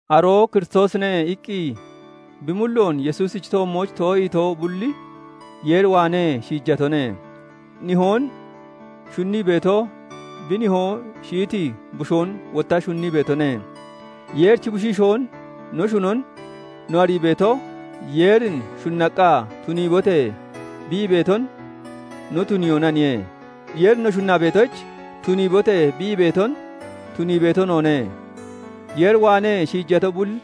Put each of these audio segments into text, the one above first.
"Aroo Kiristoosine" iqqi bi mulloon Yesuusichi toommooch too'iito bulli Yeer waanee shiijatone. Nihoon shunnii beeto bi nihoo shiyiti bushoon wotta shunnii beetone. Yeerichi bushiishoon no shunon no arii beeto, Yeerin shunnaqqa "Tuniibote!" bi ii beeton no tuniyoonaniye. Yeerin no shunnaa beetoyich, "Tuniibote!" bi ii beeton tunii beeto noone. Yeer waanee shiijato bulli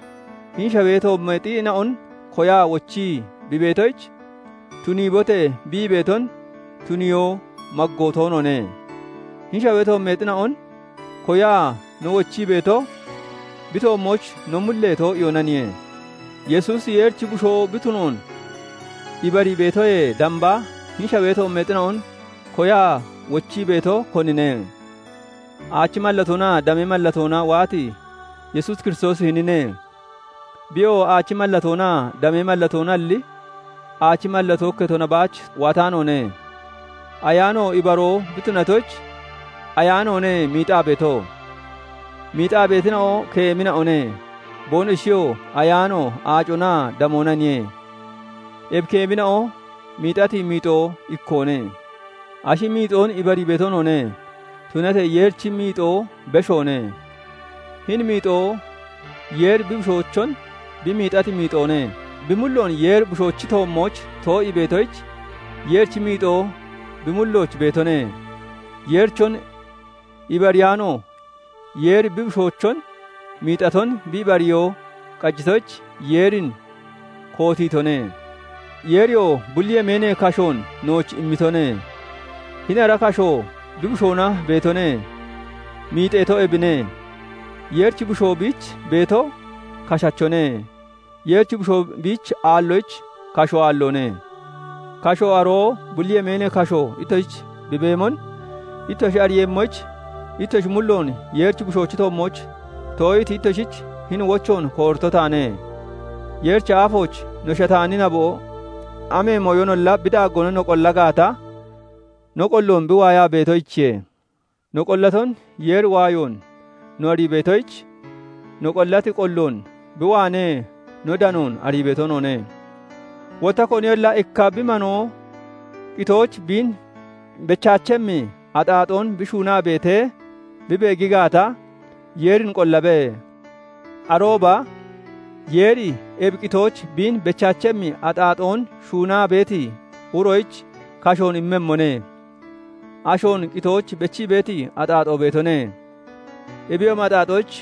hini shawee toommeexina'on koyaa wochii bi beetoyich, "Tuniibote!" bi ii beeton tuniyoo maggoo toonoone. Hini shawee toommeexina'on koyaa no wochii beeto bi toommooch no mullee too'iyoonaniye. Yesuusi Yeerichi Bushoo bi tunoon ibarii beetoyee damba, hini shawee toommeexina'on koyaa wochii beeto, konine? Aachi mallatoonaa damee mallatoona waati Yesuus Kiristoosi hinine. Biyoo aachi mallatoonaa damee mallatoonalli, aachi mallatoo ikketona baach waataanoone. Ayaano ibaroo bi tunatoyich, Ayaanoone miixaa beeto. Miixaa beetina'o keemina'one; boonoshiyo Ayaano, aaconaa damoonaniye. Ebi keemina'o miixati miixo ikkoone. Ashi miixoon ibarii beeto noone; tunatee Yeerichi miixo beshoone. Hini miixo Yeeri bi Bushoochon bi miixati miixoone; bi mulloon Yeeri Bushoochi toommooch too'ii beetoyich Yeerichi miixo bi mullooch beetone; Yeerichon ibariyaano Yeeri bi Bushoochon miixaton bi ibariyoo qajitoyich, Yeerin kootiitone. Yeeriyoo bulli yemeenee kashoon nooch immitone; hini ara kashoo bi Bushoona beetone; miixeeto ebine. Yeerichi Bushoo biich beeto, kashachone; Yeerichi Bushoo biich aalloyich kashoo aalloone. Kasho, aroo bulli yemeenee kasho, ittoshich bi beemon ittoshi ariiyemmoyich, ittoshi mulloon Yeeri Bushoochi toommooch too'iiti ittoshich hini wochoon koorito taane. Yeerichi aafooch no shataani naboo, amee mooyonolla bi daaggoona no qolla gaata, no qolloon bi waayaa beetoyichiye. No qollaton Yeeri waayoon no arii beetoyich, no qollati qolloon bi waanee no danoon arii beeto noone. Wotta koniyolla ikka bi manoo qitooch biin bechaachemmi axaaxoon bi shuunaa beetee bi beegi gaata, Yeerin qollabe; arooba Yeeri ebi qitooch biin bechaachemmi axaaxoon shuunaa beeti uroyich kashoon immemmone. Ashoon qitooch bechii beeti axaaxoo beetone; ebiyoomi axaaxoyich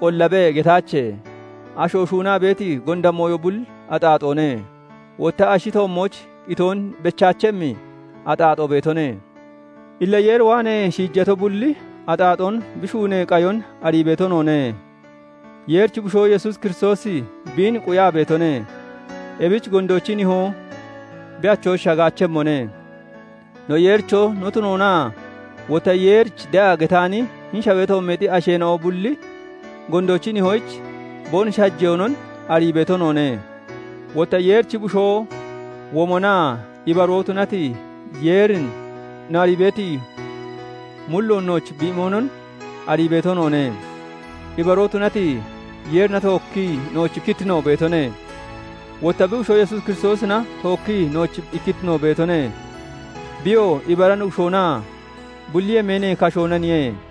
"Qollabe" getaache. Asho shuunaa beeti gonda mooyo bulli axaaxoone; wotta ashi toommooch qitoon bechaachemmi axaaxoo beetone. Illa Yeer waanee shiijato bulli axaaxoon bi shuunee qayon arii beeto noone. Yeerichi Bushoo Yesuus Kiristoosi biin quyaa beetone; ebich gondoochi nihoo bi achooch shagaachemmone. No Yeericho no tunoonaa wotta Yeerich de'a getaani, hini shawee toommeexi asheena'o bulli, gondoochi nihoyich boonoshi hajeyoonon arii beeto noone. Wotta Yeerichi Bushoo womonaa ibaroo tunati Yeerin no arii beeti mulloon nooch bi imonon arii beeto noone. Ibaroo tunati Yeerina tookkii nooch ikkittino beetone; wotta bi Bushoo Yesuus Kiristoosina tookkii nooch ikkittino beetone. Biyoo ibara Nuggushoonaa bulli yemeenee kashoonaniye.